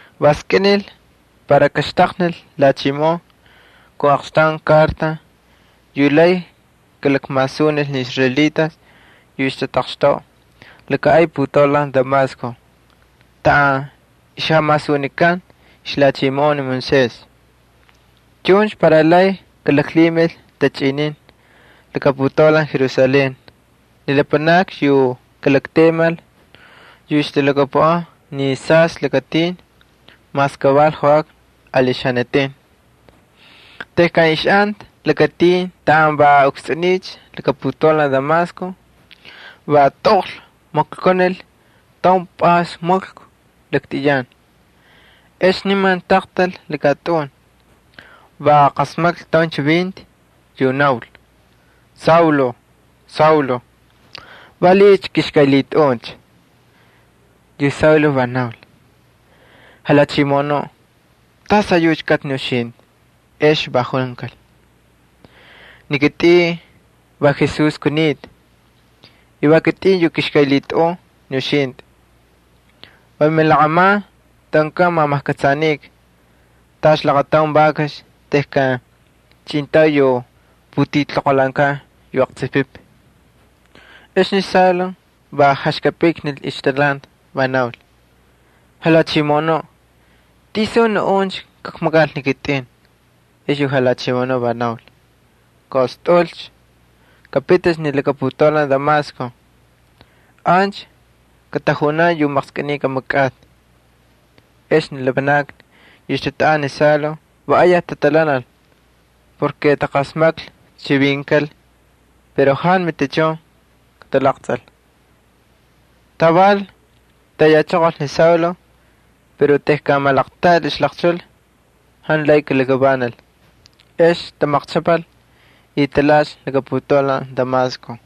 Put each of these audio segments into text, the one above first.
Va skꞌinil para kaxtaqnil lhachimoꞌon kun aqxtaun karta yu lay kalakmasunil ni israelitas yu ixtataqxtoꞌa laka ay putaulan Damasco taꞌan ixjamasunikan ixlhachimoꞌon ni israelitas. Chuncha para lay kalaklhimil tachꞌinin laka putaulan Jerusalén ni lapanakni yu kalaktemal yu ixtalhakapuꞌan ni Saystꞌi Lakatin, mas kaval joꞌakna ali xanatin. Tejkan ixꞌanta lakatin taꞌan va ukstsꞌuniycha laka putaulan Damasco va tꞌoqx maklkunil taun pꞌays maklku laktꞌiyan. Ex niman taqtal laka tꞌun, va qasmaklhi taun chivinti yu naul: —Saulo, Saulo, ¿valiꞌiycha kꞌixkꞌaylhitꞌaꞌuncha? Yu Saulo va naul: —¿Jalhachimoꞌonuꞌ, tas ayucha kꞌatꞌicha ni uxintꞌi? Ex va junkal: —Ni kitꞌin va Jesús kunita. Va kitꞌin yu kixkꞌaylhitꞌaꞌun ni uxintꞌi. [Va milaqꞌaman tꞌaꞌunkꞌan mamajkꞌatsꞌanikꞌa tacha laqataun vakax tejkan chꞌintay yu putiltoqolhaankan yu aqtsupipi. Ex ni Saulo va jaxkapꞌiknil ixtalhanti, va naul: —Jalhachimoꞌonuꞌ, ¿tisuncha naꞌun kakmakal ni kitꞌin? Ex yu Jalhachimoꞌonuꞌ va naul:] —Kaꞌostꞌaꞌulcha, kapiticha ni laka putaulan Damasco. Ancha katajunan yu maqskꞌiniy kamakꞌatꞌi. Ex ni lapanakni yu ixtatꞌaꞌanta ni Saulo va ayaj tatalhanal, va taqasmaklhi chivinkal pero jantu matichun katalaqtsꞌil. Taval tayachoqolcha ni Saulo pero tejkan malaqltiꞌal ixlaqchul jantu lay kalakavanal. Ex tamaqchꞌapal y talhaꞌalcha laka putaulan Damasco.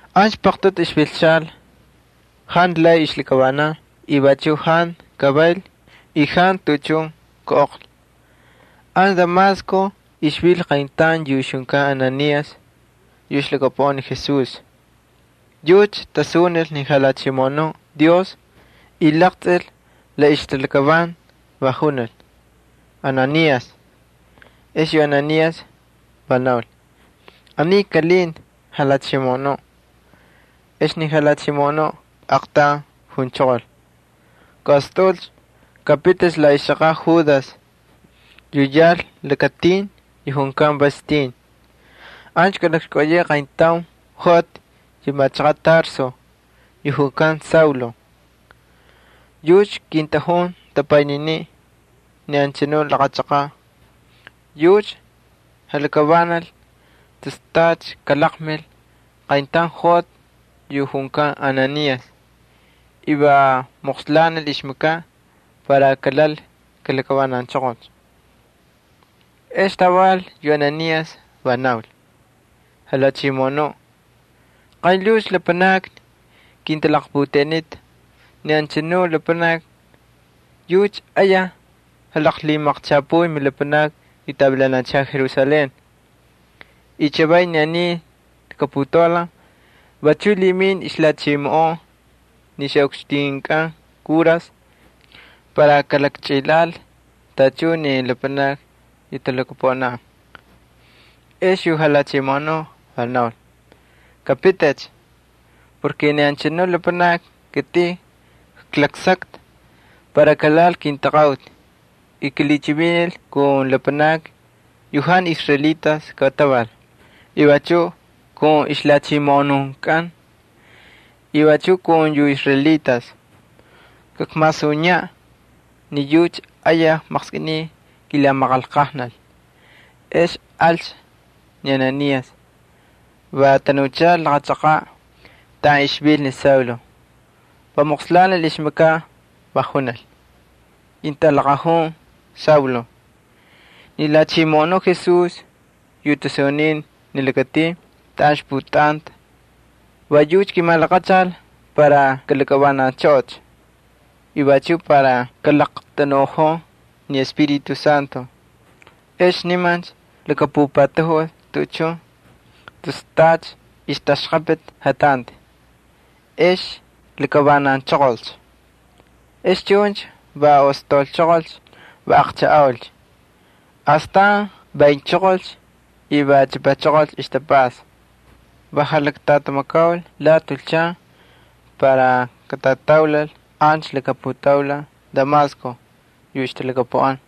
Ancha paqtꞌutu ixvilchal, jantu lay ixlakavanan y vachuꞌ jantu kavayl y jantu tuꞌuchun kaꞌoqlhi. Ancha Damasco ixvil qayntaun yu ixjunkan Ananías yu ixlhakapuꞌan ni Jesús. Yucha tasunil ni Jalhachimoꞌonuꞌ Dios y laqtsꞌil la ixtalakavanti, va junil: —Ananías. Ex yu Ananías va naul: —Aniy kꞌalinta, Jalhachimoꞌonuꞌ. Ex ni Jalhachimoꞌonuꞌ aaqtaun junchoqol: —Kaꞌostꞌaꞌulcha, kapiticha la ixchaqaꞌ Judas yu yal lakatin yu junkan Vas Tin. Ancha kꞌalakxkꞌauyeꞌe qayntaun joꞌati yu machaqaꞌ Tarso yu junkan Saulo. Yucha kintꞌajun tapaynininiꞌ ni anchanu laqa chaqaꞌ. Yucha jalakavanal tus tacha kalaqmil qayntaun joꞌati yu junkan Ananías y va moqslanil ixmakaꞌ para kalal kalakavananchoqol. Ex taval yu Ananías va naul: —Jalhachimoꞌonuꞌ, qaynlhuucha lapanakni kintalaqputeꞌenita ni anchanu lapanaki, yucha ayaj jalaqlhimaqchapuy milapanakni yu tavilanal Jerusalén. Y chavay ni aniy putaulan vachuꞌ lhiminta ixlhachimoꞌon ni ixꞌukxtinkꞌan kuras para kalakchꞌilhaꞌal tachun ni lapanakni yu talhakapuꞌan mintaqaꞌuti. Ex yu Jalhachimoꞌonuꞌ va naul: —Kapiticha. Ni anchanu lapanaki kitꞌin klaksakta para kalhaꞌal kintaqaꞌuti y kilhichivinil kun lapanakni yu jantu israelitas kataval y vachuꞌ kun ixlhachimoꞌonunkꞌan y vachuꞌ kun yu israelitas. Kakmasuniyaꞌ ni yucha ayaj maqskꞌiniy kilamaqanlqajnal. Ex alcha ni Ananías, va tanuchal laqa chaqaꞌ taꞌan ixvil ni Saulo. Va moqslanil ixmakaꞌ, va junil: —Kintꞌalaqajun Saulo, ni Jalhachimoꞌonuꞌ Jesús yu tasunin ni lakatin taꞌan ixpꞌutꞌantꞌa, va yucha kimalaqachal para kꞌalakꞌavananchꞌoꞌocha y vachuꞌ para kalaqtanuꞌojon ni Espíritu Santo. Ex nimancha lakapupatajul tuꞌuchun tus tacha ixtaxꞌapꞌiti jatanti, ex lakavananchoqolcha. Ex chuncha va ostaulchoqolcha, va aqchajꞌaulcha. Astan vaynchoqolcha y va chꞌapachoqolcha ixtapꞌasta. Va jalaktꞌatamakaul lati julchan para katꞌataulal ancha laka putaulan Damasco yu ixtalhakapuꞌan.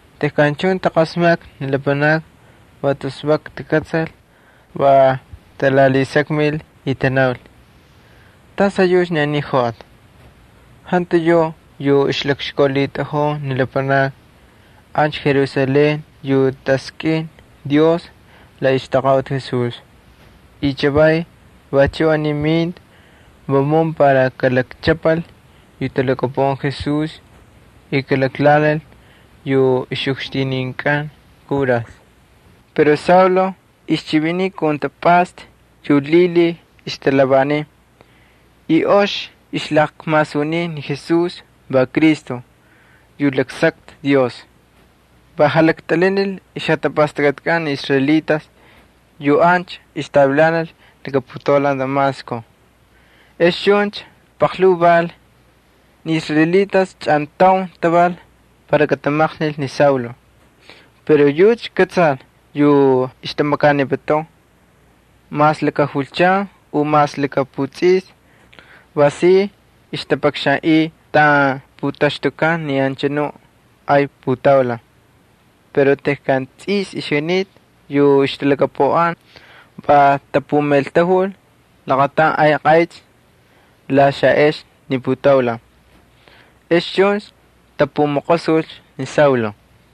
Tejkan chuncha taqasmaklhi ni lapanakni va tus vak takꞌatsal, va talalhisakmil y tanaul: —¿Tas ayucha ni aniy joꞌati? ¿Jantu yuꞌ yu lakxkaulhitꞌajun ni lapanakni ancha Jerusalén yu taskꞌin Dios la ixtaqaꞌuti Jesús? Chavay vachuꞌ aniy minta vamun para kalakchꞌapal yu talhakapuꞌan Jesús y kalaklhaꞌanil yu ixꞌukxtininkꞌan kuras. Pero ni Saulo ixchiviniy kun tapꞌasta yu lhilhiy ixtalhavaniy, y ox ixlakmasuniy ni Jesús va Cristo yu laksakta Dios. Va jalaktꞌilhinil ixjatapastakꞌatkꞌan ni israelitas yu ancha ixtavilanal laka putaulan Damasco. Ex chuncha paqlhuu val, ni israelitas chꞌantaun taval para katamaqnil ni Saulo. Pero yucha kꞌatsal yu ixtamakaniputun. Mas laka julchan u mas laka putsꞌista va si ixtapakxanꞌiy taꞌan putaxtukan ni anchanu ay putaulan. Pero tejkan tsꞌis ixjunita yu ixtalhakapuꞌan va tapumaꞌeltajul laqataun ay qaychꞌi la xaꞌexni ni putaulan. Ex chuncha tapumaqosulcha ni Saulo.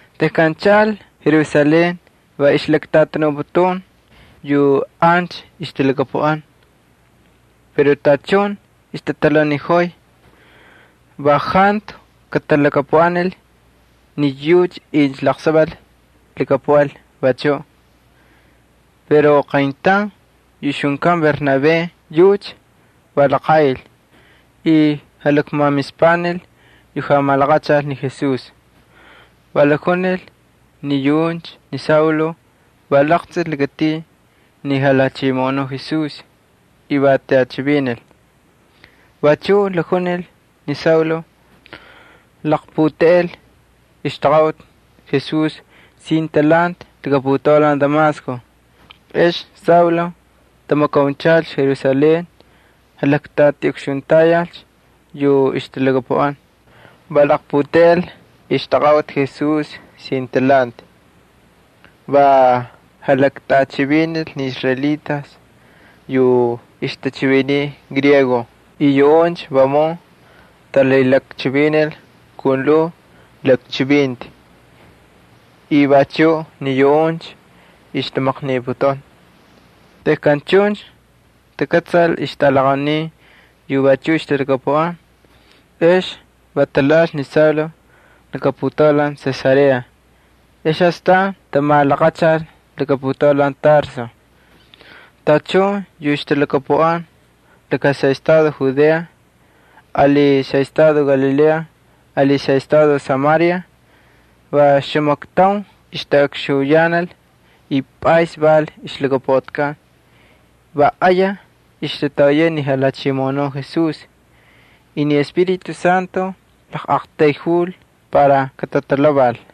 Tejkan chaꞌal Jerusalén va ixlaktꞌatanuputun yu ancha ixtalhakapuꞌan. Pero tachun ixtatalhauniꞌojoy, va jantu katalhakapuꞌanil ni yucha incha laqsaval kalhakapuꞌal vachuꞌ. Pero qayntaun yu ixjunkan Bernabé yucha va laqaꞌil, y jalakmamispanil yu jalaqmalaqachal ni Jesús. Va jalakjunil ni yuꞌuncha ni Saulo va laqtsꞌil lakatin ni Jalhachimoꞌonuꞌ Jesús, y va tꞌachivinil. Vachuꞌ jalakjunil ni Saulo laqputeꞌel ixtaqaꞌuti Jesús sin talhanti laka putaulan Damasco. Ex Saulo tamakaunchalcha Jerusalén, jalaktꞌatiꞌukxuntayalcha yu ixtalhakapuꞌan. Va laqputeꞌel ixtaqaꞌuti Jesús sin talhanti. Va jalaktꞌachivinil ni israelitas yu ixtachiviniy griego y yuꞌuncha vamun talhilakchivinil kun lhuu lakchivinti. Vachuꞌ ni yuꞌuncha ixtamaqniputun. Tejkan chuncha takꞌatsal ixjatꞌalaqaunin yu vachuꞌ ixtalhakapuꞌan, ex va talhaꞌal ni Saulo laka putaulan Cesarea, ex astan tamalaqachal laka putaulan Tarso. Tachun yu ixtalhakapuꞌan xaꞌestado Judea ali xaꞌestado Galilea ali xaꞌestado Samaria va oxamaktaun ixtaꞌukxuyanal y pꞌays val ixlhakapuꞌatikꞌan. Va ayaj ixtatoꞌoyay ni Jalhachimoꞌonuꞌ Jesús, y ni Espíritu Santo laqꞌaqtayjul para katatalhaval.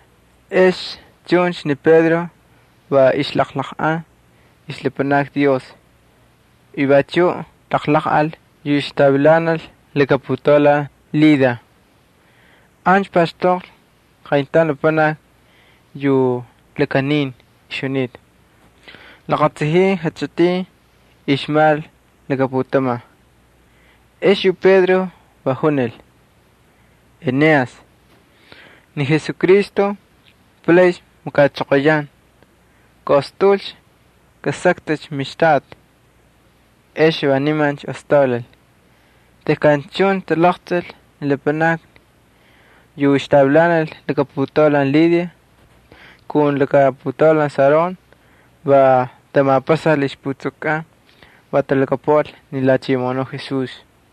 Ex chuncha ni Pedro va ixjalaqlaqꞌan ixlapanakni Dios, y vachuꞌ jalaqꞌal yu ixtavilanal laka putaulan Lida. Ancha paxtoqlhi qayntaun lapanaki yu ixlakanita, laqatsajin jachꞌitin ixmal laka putaman. Ex yu Pedro va junil: —Eneas, ni Jesucristo palaycha makachoqoyan. Kaꞌostꞌaꞌulcha, kasaktꞌicha mixtaꞌati. Ex nimancha ostaulal. Tejkan chuncha talaqtsꞌil ni lapanakni yu ixtavilanal laka putaulan Lida kun laka putaulan Sarón, va tamapaxal ixputsukukꞌan, va talhakapuꞌal ni Jalhachimoꞌonuꞌ Jesús.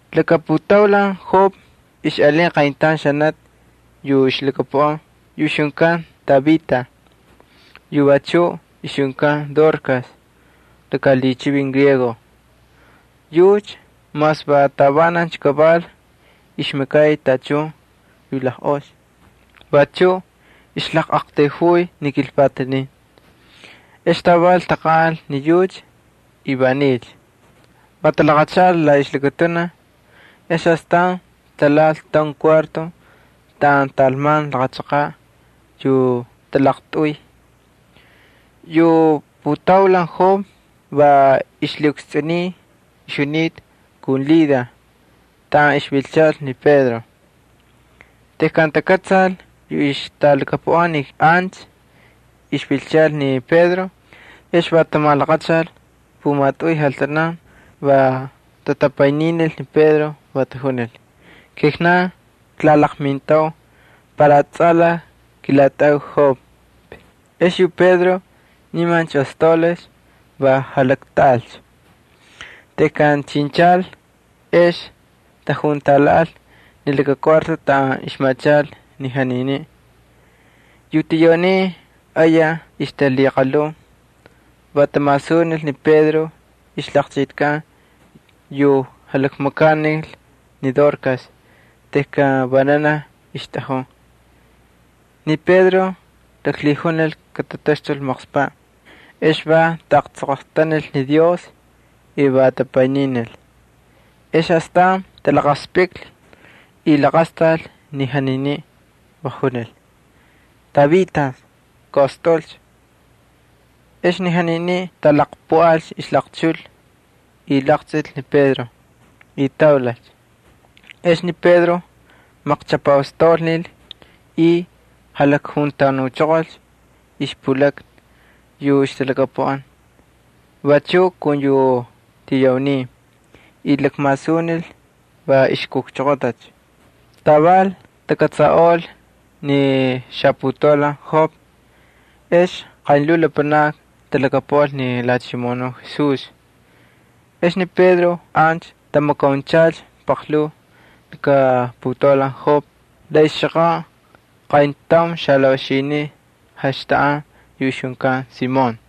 Laka putaulan Jope ixꞌalin qayntaun xanati yu ixlhakapuꞌan yu ixjunkan Tabita yu vachuꞌ ixjunkan Dorcas laka lhichivin Griego. Yucha mas va tavanancha kaval ixmakay tachun yu lajꞌox vachuꞌ ixlaqꞌaqtayjuy ni kilpatanin. Ex taval taqanꞌal ni yucha y va nilcha. Va talaqachaꞌal la ixlakatunaj, ex astan talhaꞌal taun kuarto taꞌan talman laqa chaqaꞌ yu talaqtꞌuy. Yu putaulan Jope va ixlhiꞌukstsꞌuniy ixjunita kun Lida taꞌan ixvilchal ni Pedro. Tejkan takꞌatsal yu ixtalhakapuꞌan ni ancha ixvilchal ni Pedro ex va tamalaqachal pumatꞌuy jaltanan, va tatapayninil ni Pedro, va tajunil: —Kijnan klalaqmintau para tsꞌalaj kilatꞌaꞌau Jope. Ex yu Pedro nimancha ostaulal, va jalaktꞌaꞌalcha. Tejkan chinchal ex tajuntalhaꞌal ni laka kuarto taꞌan ixmachal ni janiniꞌ. Yu tiyaunin ayaj ixtalhiqalhun, va tamasunil ni Pedro ixlaqchꞌitikꞌan yu jalakmakanil ni Dorcas tejkan vananaj ixtꞌajun. Ni Pedro laklhijunil katataxtul maqspaꞌ, ex va taꞌaqtsoqoqtanil ni Dios y va tapayninil. Ex astan talaqaspꞌiklhi y laqastal ni janiniꞌ, va junil: —Tabita, kaꞌostꞌaꞌulcha. Ex ni janiniꞌ talaqpuꞌalcha la ixlaqchul y laqtsꞌil ni Pedro, y ostaulalcha. Ex ni Pedro maqchꞌapaꞌostaulnil y jalakjuntanuchoqolcha ixpulakna yu ixtalhakapuꞌan vachuꞌ kun yu tiyaunin, y lakmasunil va ixkujchoqotacha. Taval takꞌatsaꞌolcha ni xaputaulan Jope, ex qaynlhuu lapanakni talhakapuꞌal ni Jalhachimoꞌonuꞌ Jesús. Ex ni Pedro ancha tamakaunchalcha paqlhuu laka putaulan Jope la ixchaqaꞌ qayntaun xalaꞌoxiniꞌ jaxtaꞌan yu ixjunkan Simón.